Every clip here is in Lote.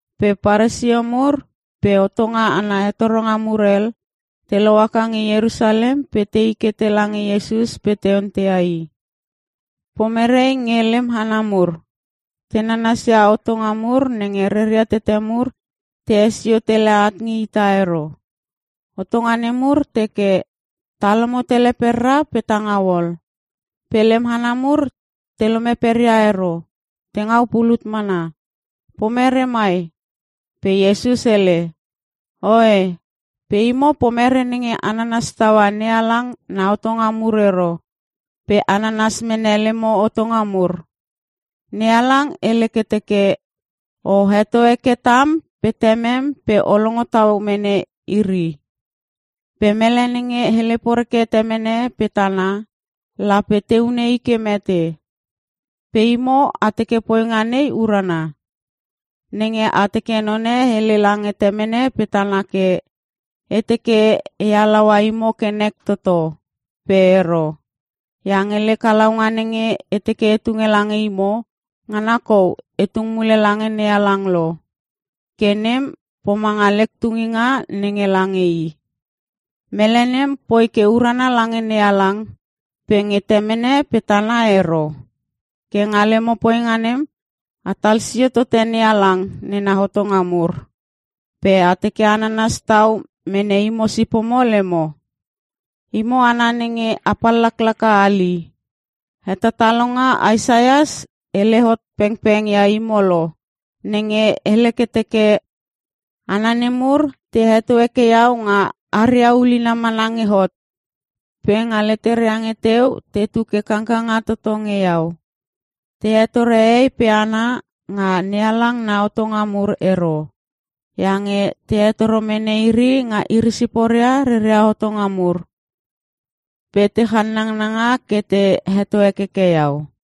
Pe Paresio mur pe hotonga ana hetoronga mur hel, te lohaka nge Ierusalem pe tei ke tela nge Iesus pe te onteia I, “Pomere nge lem hana mur? Te nanas ia hotonga mur nenge rera tete mur te hesio tele at nge ita ero. Hotonga nemur teke, ta lomo tele pera pe ta ngau ol. Pe lem hana mur te lome peria ero, te ngau pulut mana. Pomere mai?” Pe Iesus hele, “Oe! Pe imo pomere nenge a nanas taua NeHalang na hotonga mur ero, pe a nanas mene lemo hotonga mur? NeHalang hele ke teke, ‘O heto heke tam pe temem pe o longo tau mene iri. Pe mele nenge hele poreke temene pe tana, lape te hune i ke mete.’ Pe imo a teke poinga nei urana. Nenge a teke none hele lange temene pe tana ke, ‘E teke e halaua imo ke nek toto, pe ero. Iange lek halaunga nenge e teke e tunge lange imo, ngana kou e tung mule lange NeHalang lo. Ke nem, pomanga lek tunginga nenge lange I.’ Mele nem poi ke urana lange NeHalang pe nge temene pe tana ero. Ke nga lemo poinga nem mana a tal sio tote NeHalang nena hotonga mur pe a teke a nanas tau mene imo sipomo lemo. Imo hana nenge a pallaka hali! Hetatalonga Isaias hele hot pengpeng ia imo lo nenge hele ke teke “‘Hana nemur te heto heke Iau nga haria ulina mana nge hot, pe nga leteria nge teu tetu ke kangkanga toto nge Iau. Te hetore hehei pe hana nga NeHalang na hotonga mur ero. Iange te hetoro mene iri nga iri siporia reria hotonga mur. Pe te channangnanga ke te heto hekeke Iau.’”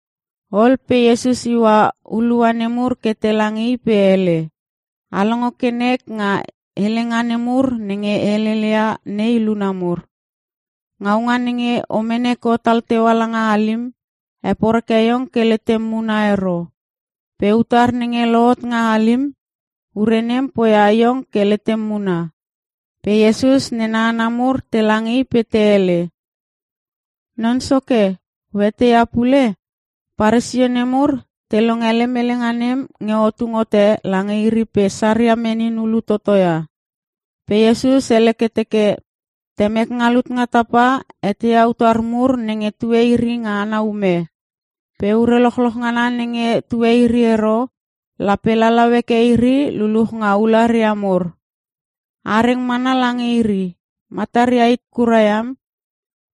Ol pe Iesus iua hulua nemur ke tela nge i pe hele, “A longo ke nek nga helenga nemur nenge e heleleia nei luna mur. Ngaunga nenge o mene ke otal teua langa halim, heporeke iong ke letem muna ero. Pe utar nenge lohot nga halim, ure nem poia iong ke letem muna.” Pe Iesus nena hana mur tela nge I pe te hele, “Non Soke, o eteia pule? Paresio nemur te longe lem helenga nem nge o tung hote lange iri pe saria menin hulu toto ia.” Pe Iesus hele ke teke, “Temek nga lut nga tapa eteia utar mur nenge tue iri nga ana ume. Pe ure lochloch ngana nenge tue iri ero, lape lalau heke iri luluch nga ularia mur. A reng mana lange iri. Mataria hit kura iam.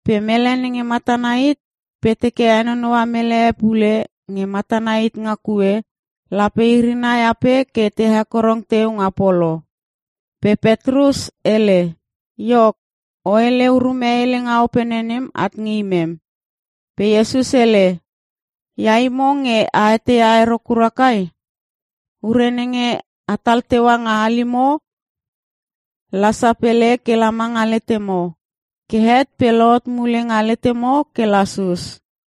Pe mele nenge matana hit pe teke henonoua mele e pule nge matana hit nga kue, lape iri nai ape ke te hekorong teu nga polo.” Pe Petrus hele, “Iok, o hele urume helenga opene nem at nge imem.” Pe Iesus hele, “Ia imo nge a etei ero kurkura kai? Ure nenge a tal teua nga halimo, la sapele kela manga letemo. Ke het pe lohot mule nga letemo ke lasus.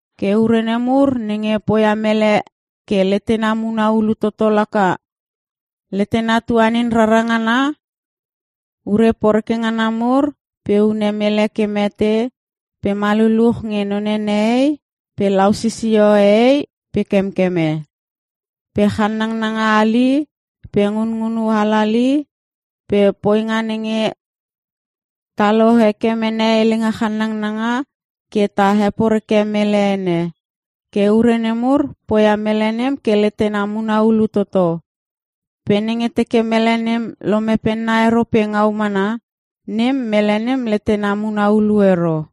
Ke ure nemur nenge poia mele nem ke letena muna hulu toto laka; letena tuanin rara ngana nga ure poreke ngana mur pe hune mele ke mete pe maluluch nge none nehei pe lau sisio hehei pe kemkeme, pe channanga halali pe ngunngunu halali pe poinga nenge taolo heke mene helenga chanangnanga ke ta heporeke mele ene. Ke ure nemur, poia mele nem ke letena muna hulu toto. Pe nenge teke mele nem lome penna ero pe ngau mana, nem poia mele nem ke letena muna hulu ero.”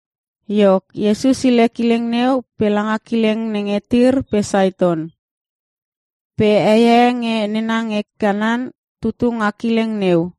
Iok, Iesus hile kileng neu pe langa kileng nenge Tir pe Saiton. Pe hei e nge nena nge Kanan tutu nga kileng neu.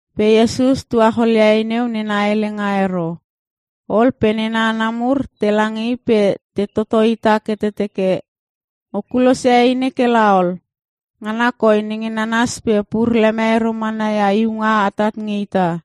Pe Iesus tuacholia hei neu nena helenga ero. Ol pe nena hana mur tela nge I pe te totohita ke te teke, “O kulosia hei nei ke la ol. Ngana koi nenge nananas pe pur leme ero mana ia iunga atat nge ita.”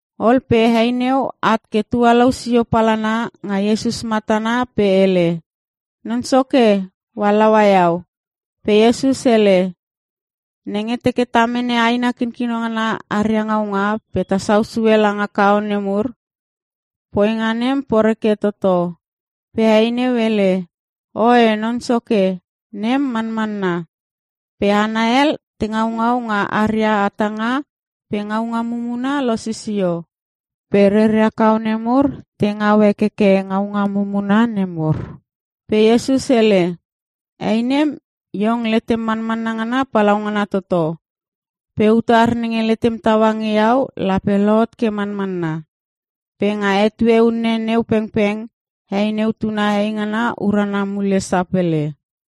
Ol pe hei neu at ke tualou sio palana nga Iesus matana pe hele, “Non Soke! O halaua iau.” Pe Iesus hele, “Nenge teke ta mene aina kinkino ngana aria ngaunga pe ta sau sue langa kaone mur, poinga nem poreke toto.” Pe hei neu hele, “Oe Non Soke, nem manmanna. Pe hana hel te ngaungau nga aria hatanga pe ngaunga mumuna losisio. Pe reria kaone mur te ngau hekeke ngaunga mumuna nemur.” Pe Iesus hele, “Hei nem, iong letem manmanna ngana palaungana toto. Pe utar nenge lemem taua nge iau lape lohot ke manmanna.” Pe nga etue unne neu pengpeng hei neu tuna heingana urana mule sapele.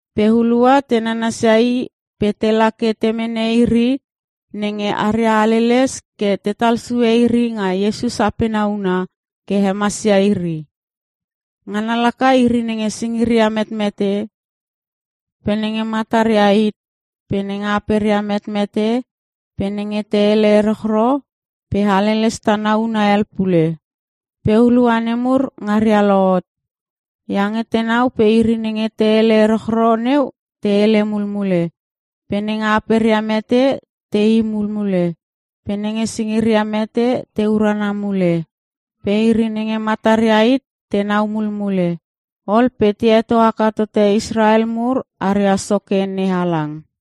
Pe hulua te nanasia I pe tela ke te mene iri nenge aria haleles ke la tetal sue iri nga Iesus apena huna ke hemasia iri. Ngana laka iri nenge singiria metmete, pe nenge mataria hit, pe nenge aperia metmete pe nenge te hele erochro pe haleles tana huna hel pule. Pe hulua nemur ngaria lohot, iange tenau pe iri nenge te hele erochro neu, te hele mulmule, pe nenge aperia mete tei mulmule, pe nenge singiria mete te urana mule, pe iri nenge mataria hit tenau mulmule. Ol pe te heto haka tote Israel mur aria Soke NeHalang.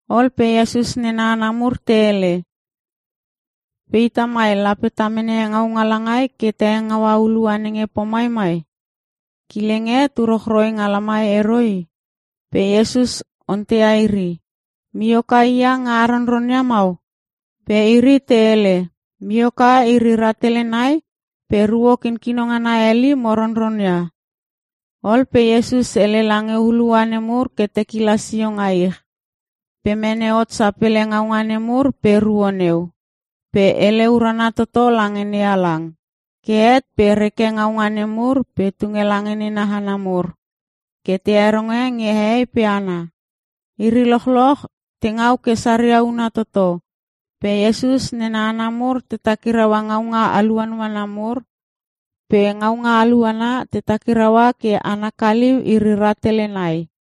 Ol pe Iesus nena hana mur te hele, “Pe ita mai lape ta mene ngaunga langai ke ta hengaua hulua nenge pomai mai? Kileng e nge tu rochroi nga lamai ero i.” Pe Iesus onteia iri, “Mioka hia nenge a ronronia mau?” Pe iri te hele, “Mioka iri rahtele nai pe ruo kinkino ngana hel i, mo ronronia.” Ol pe Iesus hele lange hulua nemur ke te kila sio nga ich. Pe mene hot sapele ngaunga nemur pe ruo neu. Pe hele urana toto lange NeHalang. Ke het pe reke ngaunga nemur pe tunge lange nena hana mur ke te heronge nge hehei pe hana. Iri lochloch te ngau ke saria una toto. Pe Iesus nena hana mur te takiraua ngaunga aluanuana mur. Pe ngaunga aluana, te takiraua ke ana kaliu iri rahtele nai.